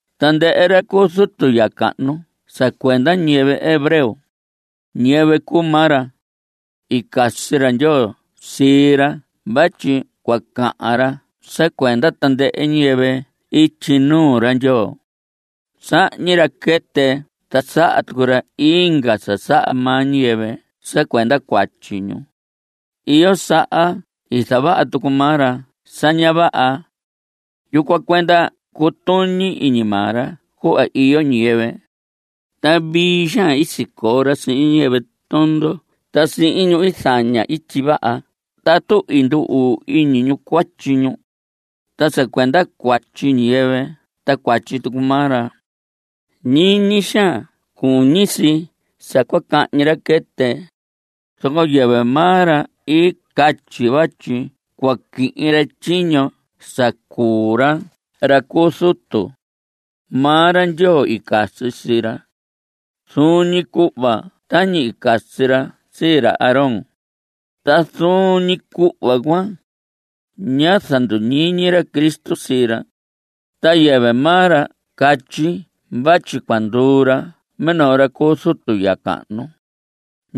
Tandɨhɨ ra cu zutu ya cahnu sa cuenda ñiyɨvɨ hebreo, ñiyɨvɨ cuu maa ra. I casi ra Ndyoo sii ra vatyi cua cahan ra sa cuenda tandɨhɨ ñiyɨvɨ ityi nuu ra Ndyoo. Sahñi ra quɨtɨ ta saha tucu ra inga sa saha maa ñiyɨvɨ sa cuenda cuatyi ñu. Iyo saha i zavaha tucu maa ra sa ña vaha. Yucuan cuenda cutuñi iñi maa ra cuhva iyo ñiyɨvɨ, ta vii xaan i sicoo ra sihin ñiyɨvɨ tondo ta sihin ñu i zaña ityi vaha tatu i ndu‑uu iñi ñu cuatyi ñu. Ta sa cuenda cuatyi ñiyɨvɨ ta cuatyi tucu maa ra, ñiñi xaan cuñi si sa cua cahñi ra quɨtɨ. Zoco yɨvɨ maa ra i catyi vatyi cua quihin ra tyiño sa cuu ra ra cu zutu. Maa ra Ndyoo i casi sii ra, zuun ñi cuhva tañi i casi ra sii ra Aarón. Ta zuun ñi cuhva cuan, ñá zanduñiñi ra Cristo sii ra, ta yɨvɨ maa ra catyi vatyi cua nduu ra minoo ra cu zutu ya cahnu.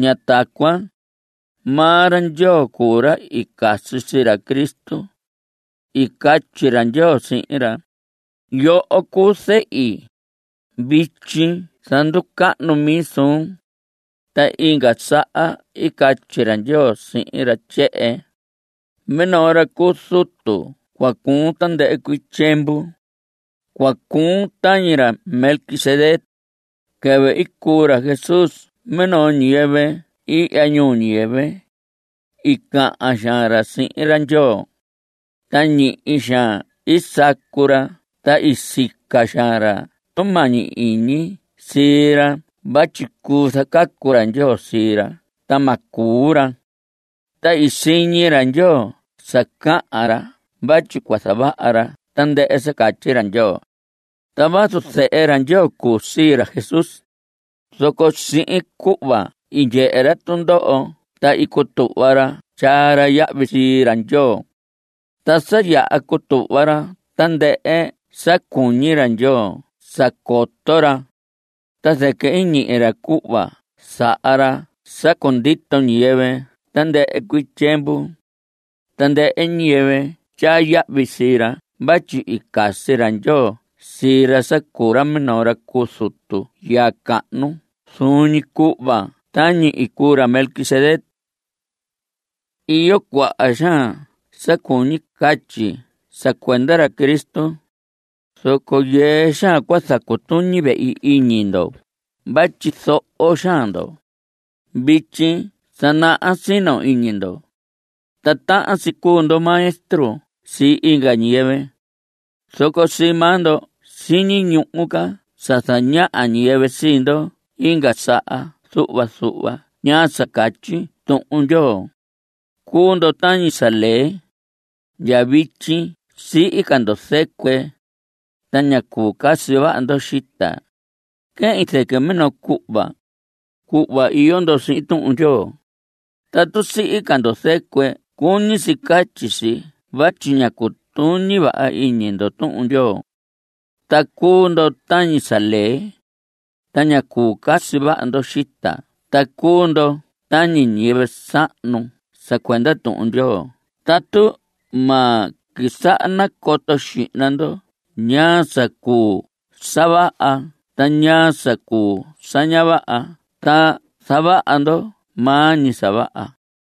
Ña tacuan. Maa ra Ndyoo cuu ra i casi sii ra Cristo. I catyi ra Ndyoo sihin ra: Yoho cuu zehi; Vityi zanducahnu mi suun. Ta inga saha i catyi ra Ndyoo sihin ra tyehen: Minoo ra cu zutu cua cuun tandɨhɨ cuii tyiemvu. Cua cuun tañi ra Melquisedec. Quɨvɨ i cuu ra Jesús minoo ñiyɨvɨ ihya ñuu ñiyɨvɨ, i cahan xaan ra sihin ra Ndyoo, ta ñihi xaan i sacu ra ta i sica xaan ra tumañi iñi sii ra vatyi cuu zacacu ra Ndyoo sii ra ta ma cuu ra. Ta i siñi ra Ndyoo sa cahan ra vatyi cua zavaha ra tandɨhɨ sa catyi ra Ndyoo. Ta vazu zehe ra Ndyoo cuu sii ra Jesús, zoco sihin cuhva i ndyehe ra tundoho ta i cutuhva ra tyaa ra yahvi sii ra Ndyoo. Ta sa yaha cutuhva ra tandɨhɨ sa cuñi ra Ndyoo sa coto ra, ta zɨquɨ i ñihi ra cuhva saha ra sa cundito ñiyɨvɨ tandɨhɨ cuii tyiemvu, tandɨhɨ ñiyɨvɨ tyaa yahvi sii ra vatyi i casi ra Ndyoo sii ra sa cuu ra minoo ra cu zutu ya cahnu zuun ñi cuhva tañi i cuu ra Melquisedec. Iyo cuaha xaan sa cuñi catyi sa cuenda ra Cristo, zoco yɨɨ xaan cua zacutuñi vehi iñi ndo vatyi zoho xaan ndo. Vityi sa naha sino iñi ndo, ta tahan si cuu ndo maestro sii inga ñiyɨvɨ. Zoco sii maa ndo siñi ñuhu ca sa zañaha ñiyɨvɨ sii ndo inga saha zuhva zuhva ñaa sa catyi Tuhun Ndyoo. Cuu ndo tañi sa lee. Ndya vityi sihi ca ndo zɨcuɨ, ta ña cuu casi vaha ndo xita. Quehin zɨquɨ minoo cuhva, cuhva iyo ndo sihin Tuhun Ndyoo. Tatu sihi ca ndo zɨcuɨ cuñi si catyi si vatyi ña cutuñi vaha iñi ndo Tuhun Ndyoo, ta cuu ndo tañi sa lee. Ta ña cuu casi vaha ndo xita ta cuu ndo tañi ñiyɨvɨ sahnu sa cuenda Tuhun Ndyoo tatu ma quisaha nacoto xihna ndo ñaa sa cuu sa vaha ta ñaa sa cuu sa ña vaha ta zavaha ndo maa ñi sa vaha.